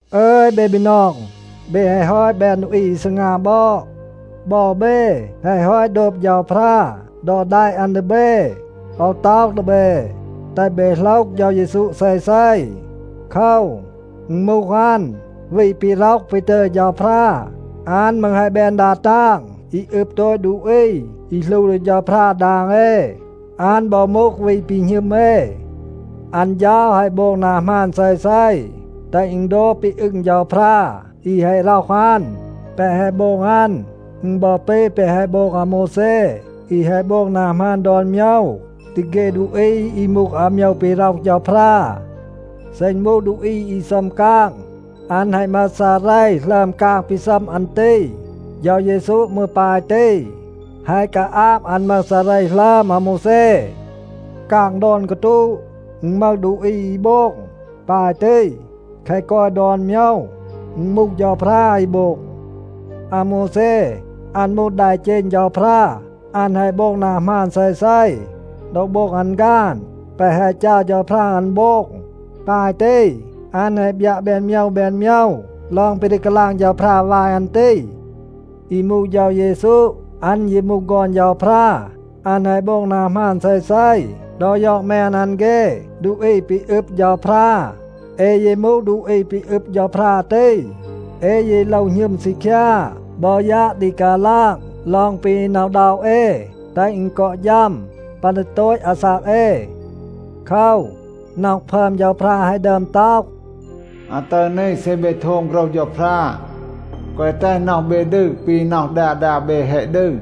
อึย เบ บีนอง, เบ แฮะ ฮอต แบน ดูอี อี ซีงา บอด. บอ เบ แฮะ ฮอต โดบ เฌาพรา ดอ แดะ อัน ดี เบ. โอว ต็อห ดี เบ, แตห เบ โหลห เฌา เยซู เซเซ. โคว, อึณ มูห อัน วี ปี ร็อห ปี ตึย เฌาพรา. อัน มืร แฮะ แบน ดา ตาง อี อึบ โตต ดูอี อี หลู ดี เฌาพรา ดาง เอ. อัน บอ มูห วี ปี หณึม เอ. อัน เฌา แฮะ โบง นา หมาน เซเซ, แตห อึณ โดบ ปี อึง เฌาพรา อี แฮะ ร็อห อัน. แปะ แฮะ โบง อัน, อึณ บอ ปี แปะ แฮะ โบง อาโมวแซ อี แฮะ โบง นา หมาน ดอน โมยว ดี เฆ ดูอี อี มูห อาโมยว ปี ร็อห เฌาพรา. เซ อึณ มูห ดูอี อี ซัม กาง, อัน แฮะ มึห ซาเร หลึอม กาง ปี ซัม อัน ตี. เฌา เยซู มืร ปาย ตี. แฮะ กาอาบ อัน มึห ซาเร หลึอม อาโมวแซ. กาง ดอน กาตูะ, อึณ มึห ดูอี อี โบง. ปาย ตี, แคะ กอย ดอน โมยว, อึณ มูห เฌาพรา อี โบง. อาโมวแซ, อัน มูห แดเจณ เฌาพรา. อัน แฮะ โบง นา หมาน เซเซ ดอ โบง อัน ฆาน แปะ แฮะ จัร เฌาพรา อัน โบง. ปาย ตี, อัน แฮะ บยัะ แบน โมยว แบน โมยว ลอง ปี ดี กาลาง เฌาพรา วาย อัน ตี. อี มูห เฌา เยซู, อัน ยี มูห ฆอน เฌาพรา. อัน แฮะ โบง นา หมาน เซเซ ดอ ยอด แมน อัน เฆ ดูอี ปี อึบ เฌาพรา. เอ ยี มูห ดูอี ปี อึบ เฌาพรา ตี. เอ ยี โลว หณึม ซีคยา บอ ยัะ ดี กาลาง ลอง ปี หน็อะ อึณด็อะ เอ, แตห อึณ กอ ฌัม ปัน ดี โตต อาซาก เอ. โคว, น็อห พึอม เฌาพรา แฮะ ดึอม ต็อห, “อาตึร นี เซ เบ โทม โฆรห เฌาพรา, แกวะ แตห น็อห เบ ดืร ปี น็อห ดา ดา เบ แฮะ ดืร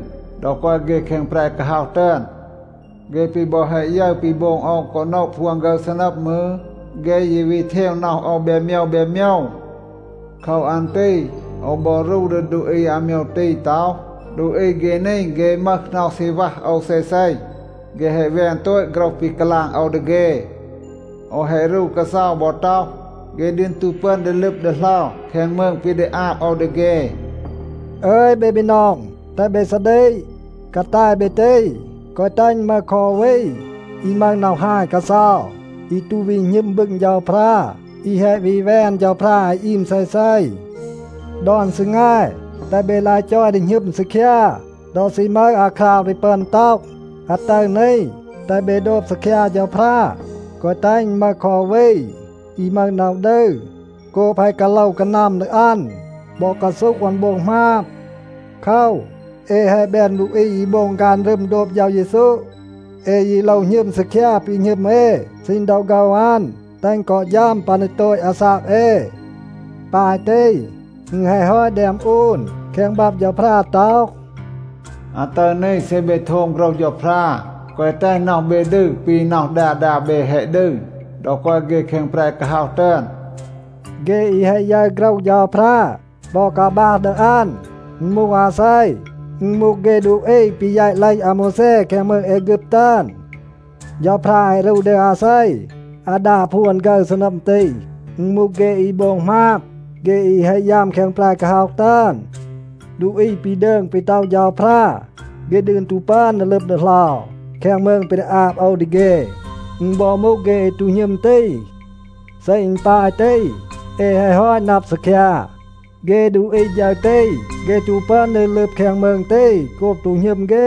ดอ กอย เฆ แคง แปร กาฮ็อห ตึอน. เฆ ปี บอ แฮะ ยึร ปี โบง โอว กอ โนะ พวน ฆึร ซีนัม มืร, เฆ ยี วี เทว น็อห โอว แบน โมยว แบน โมยว. โคว อัน ตี โอว บอ รู ดี ดูอี อาโมยว ตี ต็อห, ‘ดูอี เฆ นี, เฆ มึห น็อห ซี วัห โอว เซเซ. เฆ แฮะ แวน โตต โฆรห ปี กาลาง โอว ดี เฆ.’ โอว แฮะ รู กาเซา บอ ต็อห, ‘เฆ ดืน ตู ปึอน ดี ลึบ ดีเหลา แคง มืง ปี ดี อาบ โอว ดี เฆ.’” อึย เบ บีนอง, แตห เบ ซาดีก. กาแต เบ ตี, แกวะ แตห อึณ มึห คอ อู วี อี มึห น็อห ฮาย กาเซา, อี ตู วี หณึม บึง เฌาพรา, อี แฮะ วี แวน เฌาพรา อี อีม เซเซ. ดอน ซีแง, แตห เบ ลาย จอย ดี หณึม ซีคยา. ดอ ซี มึห อาคราว ดี ปึอน ต็อห, “อาตึร นี,” แตห เบ โดบ ซีคยา เฌาพรา. แกวะ แตห อึณ มึห คอ อู วี อี มึห น็อห ดืร โกบ แฮะ กาโลว กานัม ดี อัน บอ กาซูห อัน โบง หมาบ. โคว, เอ แฮะ แบน ดูอี อี โบง ฆาน รึม โดบ เฌา เยซู. เอ ยี โลว หณึม ซีคยา ปี หณึม เอ ซีณ ดอ โฆว อัน, แตห อึณ กอ ฌัม ปัน ดี โตต อาซาก เอ. ปาย ตี, อึณ แฮะ ฮอต แดม อูน แคง บับ เฌาพรา ต็อห, “อาตึร นี, เซ เบ โทม โฆรห เฌาพรา, แกวะ แตห น็อห เบ ดืร ปี น็อห ดา ดา เบ แฮะ ดืร ดอ กอย เฆ แคง แปร กาฮ็อห ตึอน.” เฆ อี แฮะ ยึร โฆรห เฌาพรา บอ กาบัห ดี อัน, อึณ มูห อาเซ? อึณ มูห เฆ ดูอี ปี แยต เลห อาโมวแซ แคง มืง แอฆึบ ตึอน. เฌาพรา แฮะ รู ดี อาเซ อาดา พวน ฆึร ซีนัม ตี? อึณ มูห เฆ อี โบง หมาบ, เฆ อี แฮะ ยัม แคง แปร กาฮ็อห ตึอน. ดูอี ปี ดืง ปี ต็อห เฌาพรา, “เฆ ดืน ตู ปึอน ดี ลึบ ดีเหลา แคง มืง ปี ดี อาบ โอว ดี เฆ,” อึณ บอ มูห เฆ อี ตู หณึม ตี. เซ อึณ ปาย ตี, เอ แฮะ ฮอต นับ ซีคยา, เฆ ดูอี ฌึร ตี, เฆ ตู ปึอน ดี ลึบ แคง มืง ตี โกบ ตู หณึม เฆ.